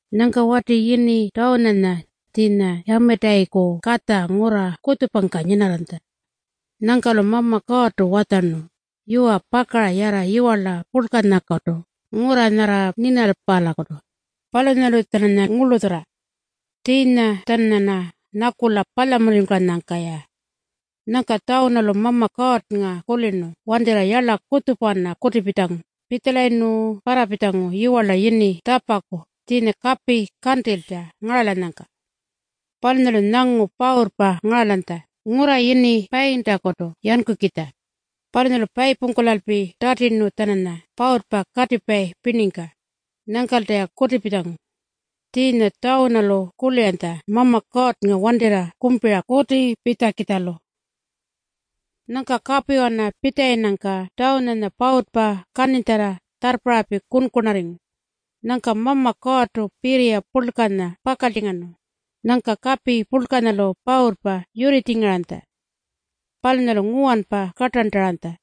Nyangka wati yini Tjawunanya, tjiinya Yamitayiku katja ngurra kutjupangka nyinarranytja. Nyangka-lu Mama Kuurrtu watjarnu, “Yuwa, pakara yarra yiwarla purlkanyakutu, ngurra nyarra Ninapalakutu. Palunyalu-tjananya ngurlutjurra. Tjiinya-tjananyarna nyakula palyamunurringkulanyangka-ya.” Nyangka Tjawunalu Mama Kuurrnga kulirnu wantirra yarla kutjupawana kutipitjangu. Pitjalayirnu parrapitjangu yiwarla yini Tjapaku tjiinya kapi kantilytja ngaralanyangka. Palunyalu nyangu pawurrpa ngaralanytja ngurra yini Payintakutu yankukitja. Palunyalu payipungkulalpi tatirnu-tjananya pawurrpa katipayi pirningka. Nyangkalta-ya kutipitjangu. Tjiinya Tjawunalu kuliranytja Mama Kuurrnga wantirra kumpira kutipitjakitjalu. Nyangka kapiwana pitjalayinnyangka Tjawunanya pawurrpa kaninytjarra tjarrparralpi kunkunarringu. Nyangka Mama Kuurrtu pirriya purlkanya pakaltjingarnu. Nyangka kapi purlkanyalu pawurrpa yurritjingaranytja. Palunyalu nguwanpa kartarntaranytja.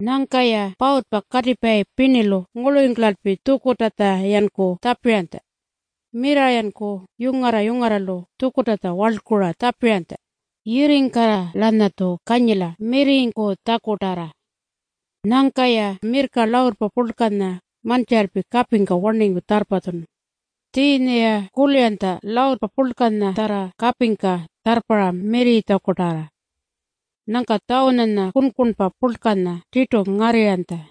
Nyangka-ya pawurrpa katipayi pirnilu ngurlurringkulalpi tjukurrtatja-yanku tjapiranytja. Mirrarra-yanku yungarra-yungarralu tjukurrtatja warlkura tjapiranytja, “Yirringkarra-lanyatju kanyila mirrirringkutjakutarra.” Nyangka-ya mirrka luurrpa purlkanya mantjiralpi kapingka warningu tjarrpatjunu. Tjiinya-ya kuliranytja luurrpa purlkanyatjarra kapingka tjarrparra mirrirritjakutarra. Nyangka Tjawunanya kunkunpa purlkanya tirtu ngarrirranytja.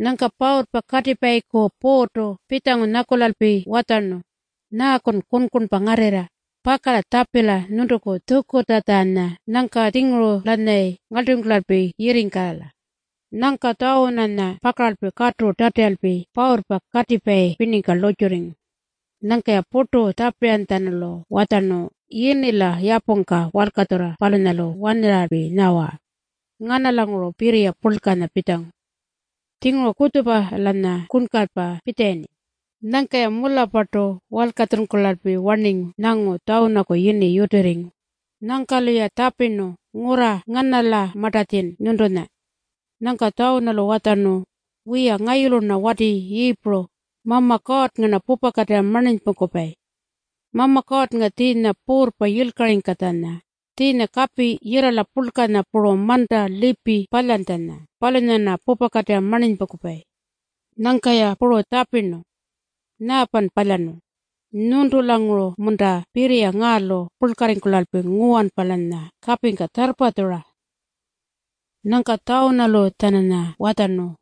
Nyangka pawurrpa katipayiku puurrtu pitjangu nyakulalpi watjarnu, “Nyaakun kunkunpa ngarrirra? Pakala tjapila nyuntuku tjukurrtatjanya nyangka-tjinguru-lanyayi ngarlturringkulalpi yirringkala.” Nyangka Tjawunanya pakarnu katu tatiralpi pawurrpa katipayi pirningka lurrtjurringu. Nyangka-ya purtu tjapiranytjatjanulu watjarnu, “Yini-la yapungka walkatjurra palunyalu warnirralpi nyawa, ‘Nganalanguru pirriya purlkanya pitjangu?’ Tjinguru kutjupa-lanya kunkanypa pitjalayirni.” Nyangka-ya mularrpartu walkatjuralpi warningu nyangu Tjawunaku yini yutirringu. Nyangka-luya tjapirnu, “Ngurra nganalamartatjin nyuntunya?” Nyangka Tjawunalu watjarnu, “Wiya, ngayulu-rna wati Yiipuru. Mama Kuurrnga-rna pupakatirra marninypungkupayi. Mama Kuurrnga tjiinya puurrpa yilkaringkatjanya, tjiinya kapi yirrala purlkanya puru manta lipi palyantjanya, palunyanya-rna pupakatirra marninypungkupayi.” Nyangka-ya puru tjapirnu, “Nyaapan palyarnu? Nyuntulanguru-munta pirriya ngaalu purlkarringkulalpi nguwanpa-lanya kapingka tjarrpatjura?” Nyangka Tjawunalu-tjananya watjarnu,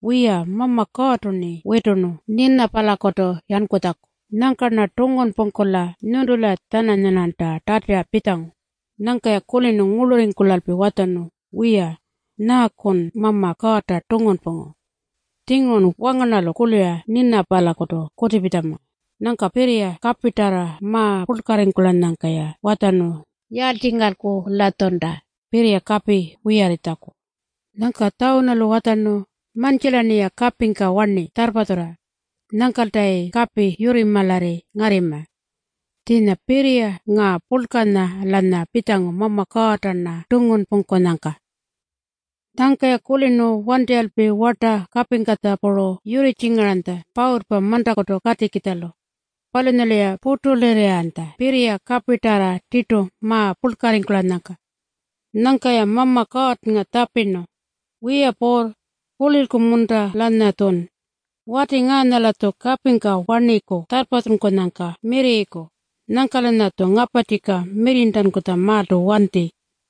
“Wiya, Mama Kuurrtu-rni witurnu Ninapalakutu yankutjaku. Nyangka-rna tungunpungkula nyuntula-tjananyarnanta tatira pitjangu.” Nyangka-ya kulirnu ngurlurringkulalpi watjarnu, “Wiya, nyaakun Mama Kuurrta tungunpungu? Tjingurun wangarnarralu kulira Ninapalakutu kutipitjama.” Nyangka pirriya kapitarra ma-purlkarringkulanyangka-ya watjarnu, “Yaaltjingalku-latjunta pirriya kapi wiyarringkutjaku?” Nyangka Tjawunalu watjarnu, “Mantjila-rniya kapingka warni tjarrpatjurra. Nyangkaltayi kapi yurrimaralarri ngarrima. Tjiinya pirriya ngaa purlkanya-lanya pitjangu Mama Kuurrta-rna tungunpungkunyangka.” Nyangka-ya kulirnu wantirralpi warta kapingkatja puru yurritjingaranytja pawurrpa mantakutu katikitjalu. Palunyalu-ya purtulirrirranytja pirriya kapitarra tirtu ma-purlkarringkulanyangka. Nyangka-ya Mama Kuurrnga tjapirnu, “Wiya Puurr, kulilku-munta-lanyatjun? Wati ngaanya-latju kapingka warniku tjarrpatjunkunyangka mirrirriku. Nyangka-lanyatju ngaparrtjika mirrirntankutjamaaltu wanti.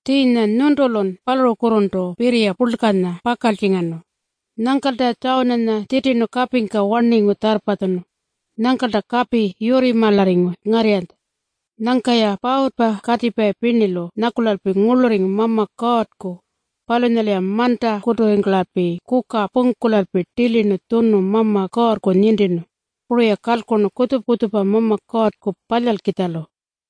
Tjiinya nyuntulun palurukurrurntu pirriya purlkanya pakaltjingarnu.” Nyangkalta-ya Tjawunanya tjitirnu kapingka warningu tjarrpatjunu. Nyangkalta kapi yurrimaralarringu ngarrirranytja. Nyangka-ya pawurrpa katipayi pirnilu nyakulalpi ngurlurringu Mama Kuurrku. Palunyalu-ya mantakuturringkulalpi kuka pungkulalpi tilirnu tjunu Mama Kuurrku nintirnu. Puru-ya kalkurnu kutjupa-kutjupa Mama Kuurrku palyalkitjalu.